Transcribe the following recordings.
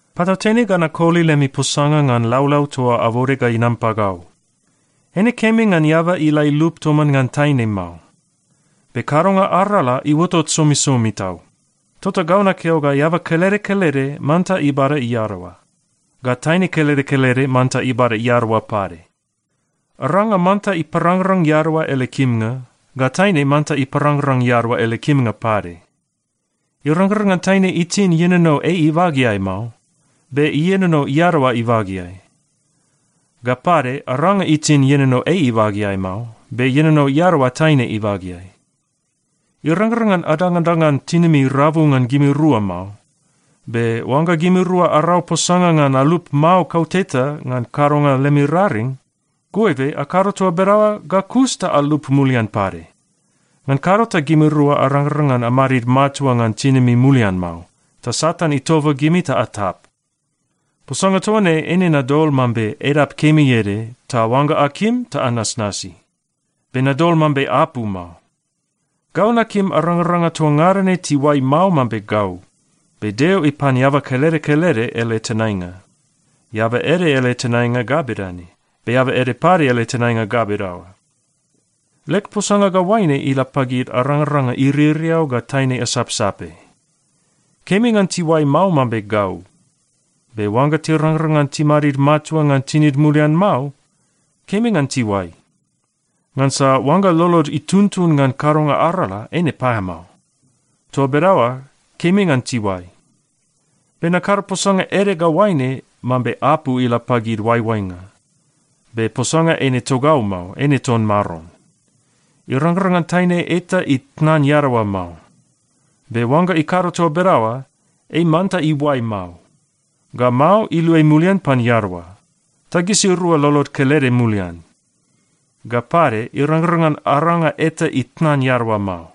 Patautene ga nakoli lemi posanga ngan laulau toa abode ga inam pagau. Eine kemi ngan eaba ila ilup toman ngan taine mao. Be kadonga arala iuotot somisomi tau, tota gau nakeo ga eaba kelede kelede manta ibada iadaoa. Ga taine kelede kelede manta ibada iadaoa pade. Aranga manta iparangrang iadaoa ele kimnga, ga taine manta iparangrang iadaoa ele kimnga pade. Irangrang ngan taine itin ienono ei ibageai mao, be ienono iadaoa ibageai. Ga pade, aranga itin ienono ei ibageai mao, be ienono iadaoa taine ibageai. Irangrang ngan adangadangan tinimi rabu ngan gimirua mao. Be oangga gimirua arau posanga ngan alup mao kauteta ngan kadonga lemi raring, goibe akado toa bedaoa ga kus ta alup mulian pade. Ngan kado ta gimirua arangrang ngan amadid matua ngan tinimi mulian mao, ta Satan itoba gimi ta atap. Posanga toa ne eine nadol mambe edap kemi ede, ta oangga akim, ta anasnasi. Be nadol mambe apu mao. Gau nakim arangaranga toa ngada ne tiuai mao mambe gau. Be Deo ipan eaba kelede kelede ele tenainga. Eaba ede ele tenainga ga bedane, be eaba ede pade ele tenainga ga bedaoa. Leg posanga ga oaine ila pagid arangaranga iririau ga taine asapsape. Kemi ngan tiuai mao mambe gau. Be oangga tirangrang ngan timadid matua ngan tinid mulian mao, kemi ngan tiuai. Ngansa oangga lolod ituntun ngan kadonga arala, eine paeamao. Toa bedaoa kemi ngan tiuai. Be nakado posanga ede ga oaine mambe apu ila pagid oaioainga, be posanga eine togau mao, eine ton Maron. Irangrang ngan taine eta itnan iadaoa mao. Be oangga ikado toa bedaoa, ei manta iuai mao. Ga mao, iluai mulian pan iadaoa, ta gisirua lolod kelede mulian. Ga pade, irangrang ngan aranga eta itnan iadaoa mao.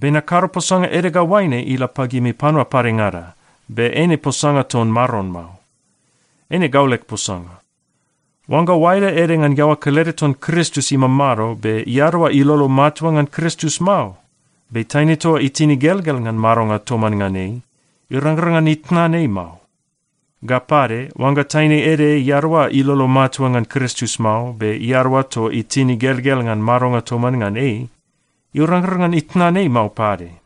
Be nakado posanga ede ga oaine ila pagimi panua padengada, be eine posanga ton Maron mao. Eine gau leg posanga. Oangga oaeda ede ngan iaoa kelede ton Kristus imamado be iadaoa ilolo matua ngan Kristus mao, be taine toa itin igelgel ngan madonga toman ngan ei, irangrang ngan itnan ei mao. Ga pade, oangga taine ede iadaoa ilolo matua ngan Kristus mao, be iadaoa toa itin igelgel ngan madonga toman ngan ei, irangrang ngan itnan ei mao pade.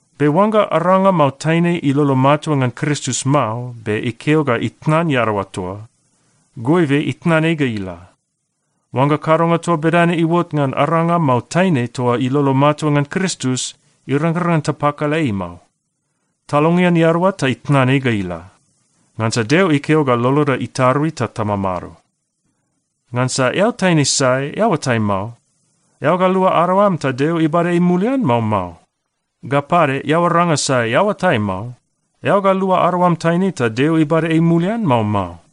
Be oangga aranga mao taine ilolo matua ngan Kristus mao, be ikeo ga itnan iadaoa toa, goibe itnan ei ga ila. Oangga kadonga toa bedane iuot ngan aranga mao taine toa ilolo matua ngan Kristus, irangrang ngan tapakala ei mao. Talongean iadaoa ta itnan ei ga ila. Ngansa Deo ikeo ga loloda itarui ta tamamado. Ngansa eao taine sai, eao oatai mao, eao ga lua adaoam ta Deo ibada ei mulian, mao mao? Ga pade, eao aranga sai, eao oatai mao, eao ga lua adaoam taine ta Deo ibada ei mulian, mao mao?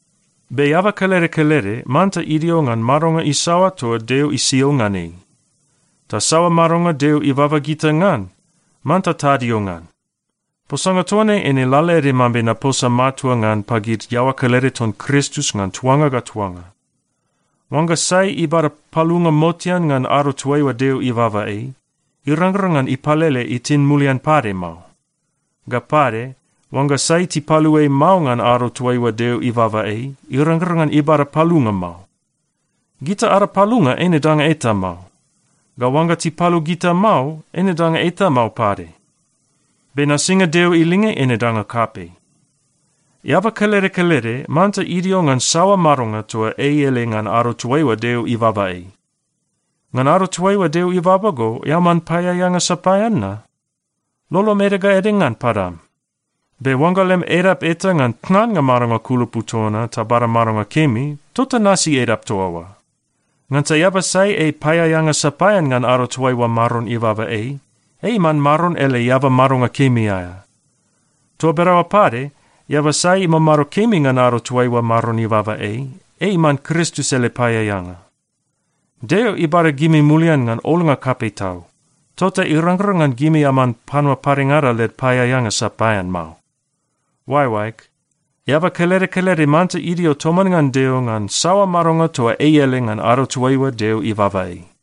Be eaba kelede kelede manta idio ngan madonga isaoa toa Deo isio ngan ei. Ta saoa madonga Deo ibaba gita ngan, manta tadio ngan. Posanga toa ne eine lalaede mambe naposa matua ngan pagid iaoa kelede ton Kristus ngan tuanga ga tuanga. Oangga sai ibada palunga motean ngan ado toaiua Deo ibaba ei, irangrang ngan ipalele itin mulian pade mao. Ga pade, oangga sai tipalu ei mao ngan ado toaiua Deo ibaba ei, irangrang ngan ibada palunga mao. Gita ada palunga eine danga eta mao. Ga oangga tipalu gita mao, eine danga eta mao pade. Be nasinga Deo ilinge eine danga kapei. Eaba kelede kelede manta idio ngan saoa madonga toa ei ele ngan ado toaiua Deo ibaba ei. Ngan ado toaiua Deo ibaba go, eao man paeaeanga sapaean na? Lolom ede ga ede ngan padam. Be oangga lem edap eta ngan tnannga madonga kulupu toa na ta bada madonga kemi, tota nasi edap toa oa. Ngansa eaba sai ei paeaeanga sapaean ngan ado toaiua Maron ibaba ei, ei iman Maron ele eaba madonga kemi aea. Toa bedaoa pade, eaba sai imamado kemi ngan ado toaiua Maron ibaba ei, ei iman Kristus ele paeaeanga. Deo ibada gimi mulian ngan olnga kapei tau. Tota irangrang ngan gimi aman panua padengada led paeaeanga sapaean mao. Oaeoaeg, eaba kelede kelede manta idio toman ngan Deo ngan saoa madonga toa ei ele ngan ado toaiua Deo ibaba ei.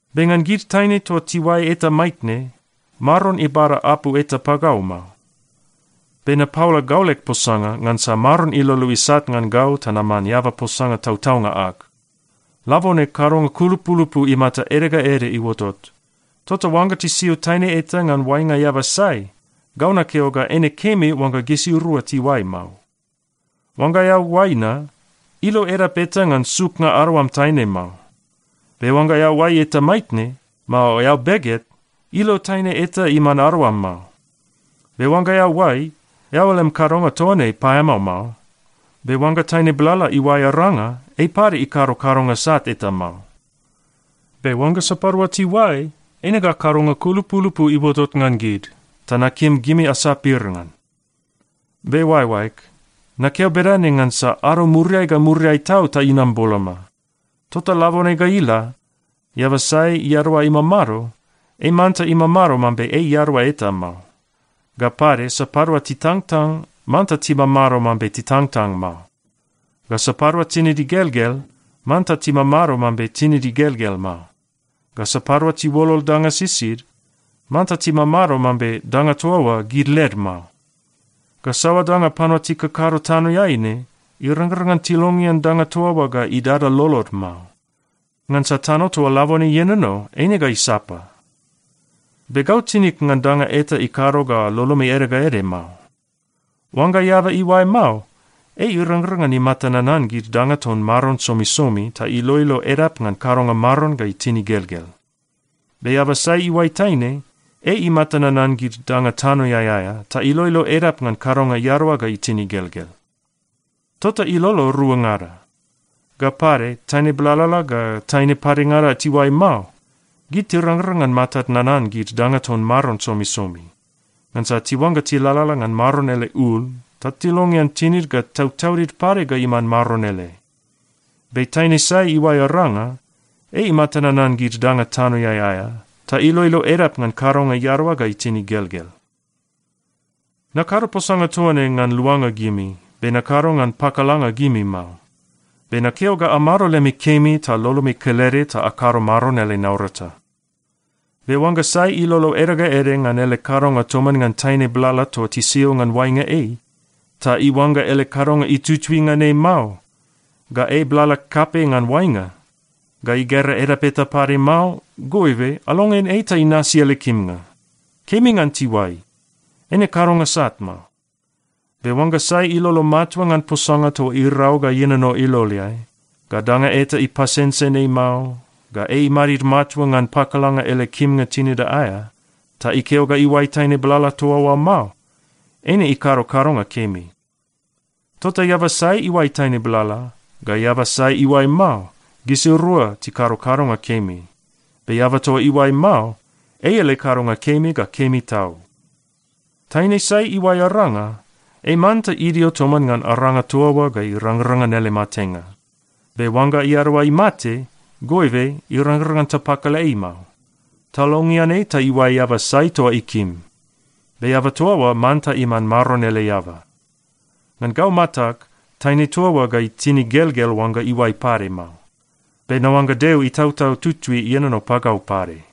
Be ngan gid taine toa tiuai eta maitne, Maron ibada apu eta pagau mao. Be napaola gau leg posanga, ngansa Maron ilolo isat ngan gau ta naman eaba posanga tautaunga ag. Labone kadonga kulupulupu imata ede ga ede iuotot, tota oangga tisio taine eta ngan oainga eaba sai, gau nakeo ga eine kemi oangga gisirua tiuai mao. Oangga eao oai na, ilo edap eta ngan suknga adaoam taine mao. Be oangga eao oai eta maitne, mao eao beget, ilo taine eta iman adaoam mao. Be oangga eao oai, eao lem kadonga toa ne paeamao mao. Be oangga taine blala iuai aranga, ei pade ikado kadonga sat eta mao. Be oangga sapadua tiuai, eine ga kadonga kulupulupu iuotot ngan gid, ta nakim gimi asapir ngan. Be oaeoaeg, nakeo bedane ngansa ado muriai ga muriai tau ta inam boloma. Tota labone ga ila, eaba sai iadaoa imamado, ei manta imamado mambe ei iadaoa eta mao. Ga pade sapadua titangtang, manta timamado mambe titangtang mao. Ga sapadua tinid igelgel, manta timamado mambe tinid igelgel mao. Ga sapadua tiuolol danga sisid, manta timamado mambe danga toa oa gid led mao. Ga saoa danga panua tikakado tanoeai ne, irangrang ngan tilongean danga toa oa ga idada lolod mao. Ngansa tano toa labone ienono, eine ga isapa. Be gau tinig ngan danga eta ikado ga lolomi ede ga ede mao. Oangga eaba iuai mao, ei irangrang ngan imata nanan gid danga ton Maron somisomi, ta iloilo edap ngan kadonga Maron ga itin igelgel. Be eaba sai iuai taine, ei imata nanan gid danga tanoeai aea, ta iloilo edap ngan kadonga iadaoa ga itin igelgel. Tota ilolo ruangada. Ga pade, taine blalala ga taine padengada tiuai mao, gid tirangrang ngan matad nanan gid danga ton Maron somisomi. Ngansa tiuangga tilalala ngan Maron ele ul, ta tilongean tinid ga tautaudid pade ga iman Maron ele. Be taine sai iuai aranga, ei imata nanan gid danga tanoeai aea, ta iloilo edap ngan kadonga iadaoa ga itin igelgel. Nakado posanga toa ne ngan luanga gimi. Be nakado ngan pakalanga gimi mao. Be nakeo ga amado lemi kemi ta lolomi kelede ta akado Maron ele naurata. Be oangga sai ilolo ede ga ede ngan ele kadonga toman ngan taine blala toa tisio ngan oainga ei, ta iuangga ele kadonga itutui ngan ei mao, ga ei blala kapei ngan oainga, ga igera edap eta pade mao, goibe, alongean ei ta inasi ele kimnga. Kemi ngan tiuai. Eine kadonga sat mao. Be oangga sai ilolo matua ngan posanga toa irau ga ienono iloleai, ga danga eta ipasensen ei mao, ga ei imadid matua ngan pakalanga ele kimnga tinida aea, ta ikeo ga iuai taine blala toa oa mao, eine ikado kadonga kemi. Tota eaba sai iuai taine blala, ga eaba sai iuai mao, gisirua tikado kadonga kemi. Be eaba toa iuai mao, ei ele kadonga kemi ga kemi tau. Taine sai iuai aranga, ei manta idio toman ngan aranga toa oa ga irangrang ngan ele matenga. Be oangga iadaoa imate, goibe irangrang ngan tapakala ei mao. Talongean ei ta iuai eaba sai toa ikim. Be eaba toa oa manta iman Maron ele eaba. Ngan gau matag, taine toa oa ga itin igelgel oangga iuai pade mao. Be naoangga Deo Itautau Tutui ienono pagau pade.